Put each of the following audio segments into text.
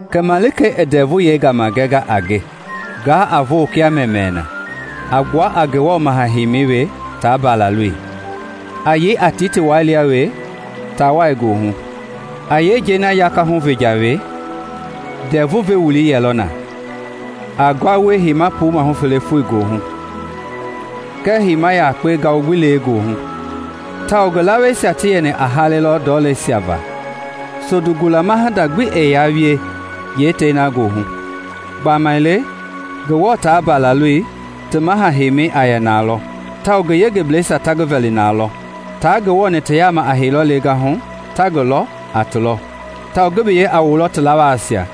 Kɛ malikei i ndɛvu yɛi gama gɛnga a nge, nga a vo kia mɛmɛɛ na, a gbua a Ngewɔ maha-heimɛi we taa Mbalaloi, a yei a tiitii wai lia we taawai goohu. A yeenjei yakahu venjɔ we, ndɛvu ve wuli yɛlɔ na, a ngua wie heima puu mahu fele foi goohu, kɛɛ heima yakpe ma ngawu gbi lee goohu; tawao ngi laweisia ti yɛni a hale lɔ ndɔleisia va. Sondu gulama hinda gbi ɛɛ yaa wie yeetei na goohu; gbamaile Ngewɔ taa Mbalaloi ti maha heimi a yɛ nalɔ, tawao ngi yengebleisia ta ngi vɛli nalɔ. Taa Ngewɔ-ni ti yaama a heilɔ lengahu ta ngi lɔ a ti lɔ, tawao ngi biyei a wulɔ ti lawaasia.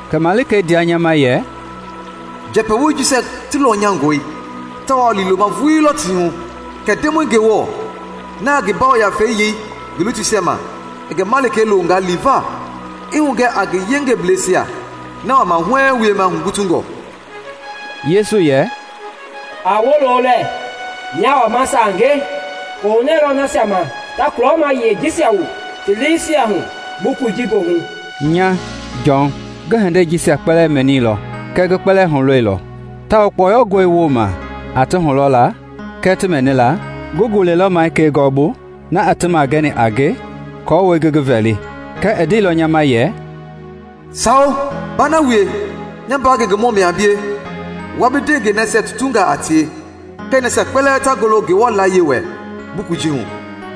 Kɛ malikei ndea nya ma yɛ, “Njɛpɛ woi jisia ti lɔnyangɔi tawao liiloma vuii lɔ ti hu. Kɛ Ndemɔi Ngewɔ, na a ngi Yafei yei ngi lutuisia ma, i ngi malikei loonga liva i hugɛ a ngi yengebleisia na wama huɛɛŋ wiema hugutungɔ.” Yesu yɛ, “A woolo lɛ, nyaa wama sange! Koohunɛɛ lɔ nasia ma ta kulɔma yie jisia wu ti liisia hu bukui ji goohu!” Nya, Jɔn, ngi hindei jisia mɛnilɔ kɛɛ ngi kpɛlɛɛ hulɔilɔ, tawao kpɔyɔngɔi woma a ti hulɔla kɛɛ ti mɛnila, ngi gulɛilɔ malikei gɔɔbu na i ti magɛni a nge aako ngi ngi vɛli. Kɛɛ i ndeilɔ nya ma yɛ, “Sawo baa na wie! Nya mbaa ngengemɔ mia a bie wua bi ndewengei nasia tutungaa a tie kɛɛ nasia kpɛlɛɛ ta ngolo Ngewɔ layie wɛ bukui ji hu.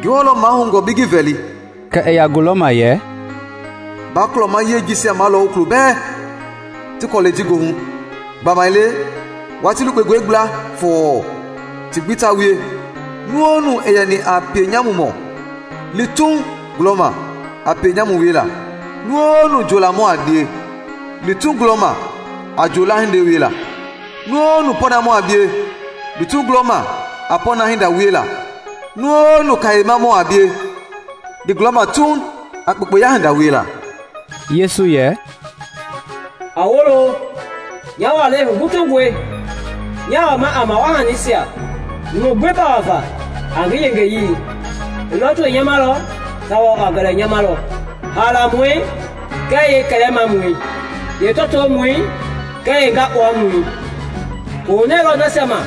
Ngewɔ lɔ mahoungɔ bi ngi vɛli!” Kɛ i ya gulɔma yɛ, “Baa kulɔma yie jisia malɔwu kulo bɛɛ ti kɔlɛi ji goohu, gbamaile watii lukpengɔe gbla fɔɔ ti gbi ta wie. Nu-o-nu i yɛni a pienyamumɔ, li tuuŋ gulɔma a pienyamu wiela, nu-o-nu njoolamɔ a bie, li tuuŋ gulɔma a njoola hinda wiela; nu-o-nu pɔɔnamɔ a bie, li tuuŋ gulɔma a pɔɔna hinda wiela; nu-o-nu kayemamɔ a bie, li gulɔma tuuŋ a kpekpeya hinda wiela.” Yesu yɛ, “A woolo, nya walei hugutungɔi! Nyaa wama a mawaa hanisia numu gbi pawa va a ngi yengeyii. I lɔtoi nyamalɔ tawao a gɛlɛ nyamalɔ, haalamɔi kɛɛ yeekɛlɛmamɔi, yeetɔɔtomɔi kɛɛ yeengakpuamɔi.” Koohunɛɛ lɔ nasia ma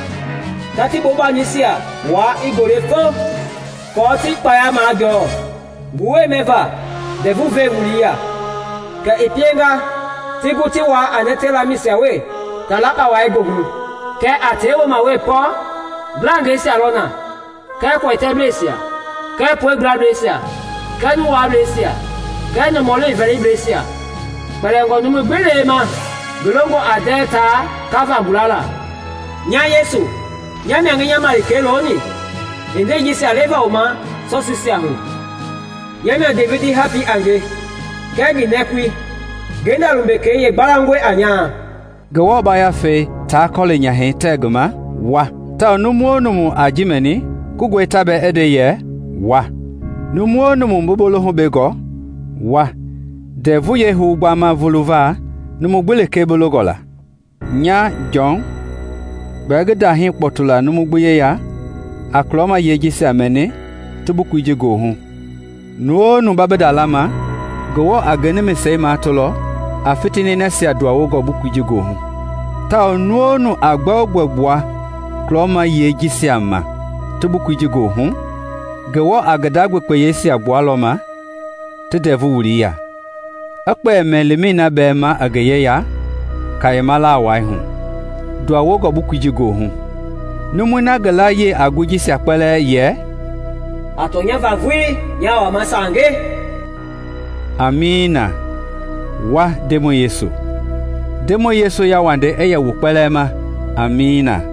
ta ti bombanisia wua i gole fo aako ti kpaya majɔɔ ngu wuɛi mɛva ndɛvu ve wulii ya, kɛ i pienga ti gu ti wuaa a nɛtɛi lamɛisia we taalakpawai goohu. Kɛɛ a tɛi woma we pɔ, ngilangɛisia lɔ na kɛɛ kuɛtɛblesia kɛɛ puegbuableisia kɛɛ nu waableisia kɛɛ nɔmɔli vɛlibleisia, kpɛlingɔ numui gbi lee ma ngi longɔ a ndɛɛ taa kava gula la. “Nya Yesu, nya mia ngi nya malikei looni hindeisia jisia leva wu ma sɔsiisiahu. Nya mia Devidi hapii a nge kɛɛ ngi nɛkui, ngenda lumbekei yee gbalaungɔi a nyaa.” Ngewɔ Yafei taa kɔli nyahɛi tɛ ngi ma, “Wa!” Tawao nu-o-nu a ji mɛni koungɔ ta bɛɛ i nde yɛ, “Wa!” Nu-o-nu bi bolohu bengɔ, wa; ndɛvu yɛi hou gbama fuluva numu gbi lekee bi longɔ la. Nya, Jɔn, gbɛɛ ngi ndahii kpɔtu la numui gbi yeya a kulɔma yiɛi jisia mɛni ti bukui ji goohu; nu-o-nu ba bi nda lama, Ngewɔ a ngi nimise matolɔ a fitini nasia nduanwongɔ bukui ji goohu. Tawao nu-o-nu a gbɛogbɛ gbua kulɔma yiɛi jisia ma ti bukui ji goohu, Ngewɔ a ngi nda gbekpeyeisia gbualɔ ma ti ndɛvu wuli ya i kpɛli mɛmii bɛɛ ma i ngi yeya kayema lawai hu, nduawongɔ bukui ji goohu. Numui na ngi layia a ngooi jisia kpɛlɛɛ yɛ, “A tɔnya va vuii, nyaa wama sange!” Amiina. Wa, Ndemɔi Yesu! Ndemɔi Yesu yauwandei i yɛ wu kpɛlɛɛ ma. Amiina.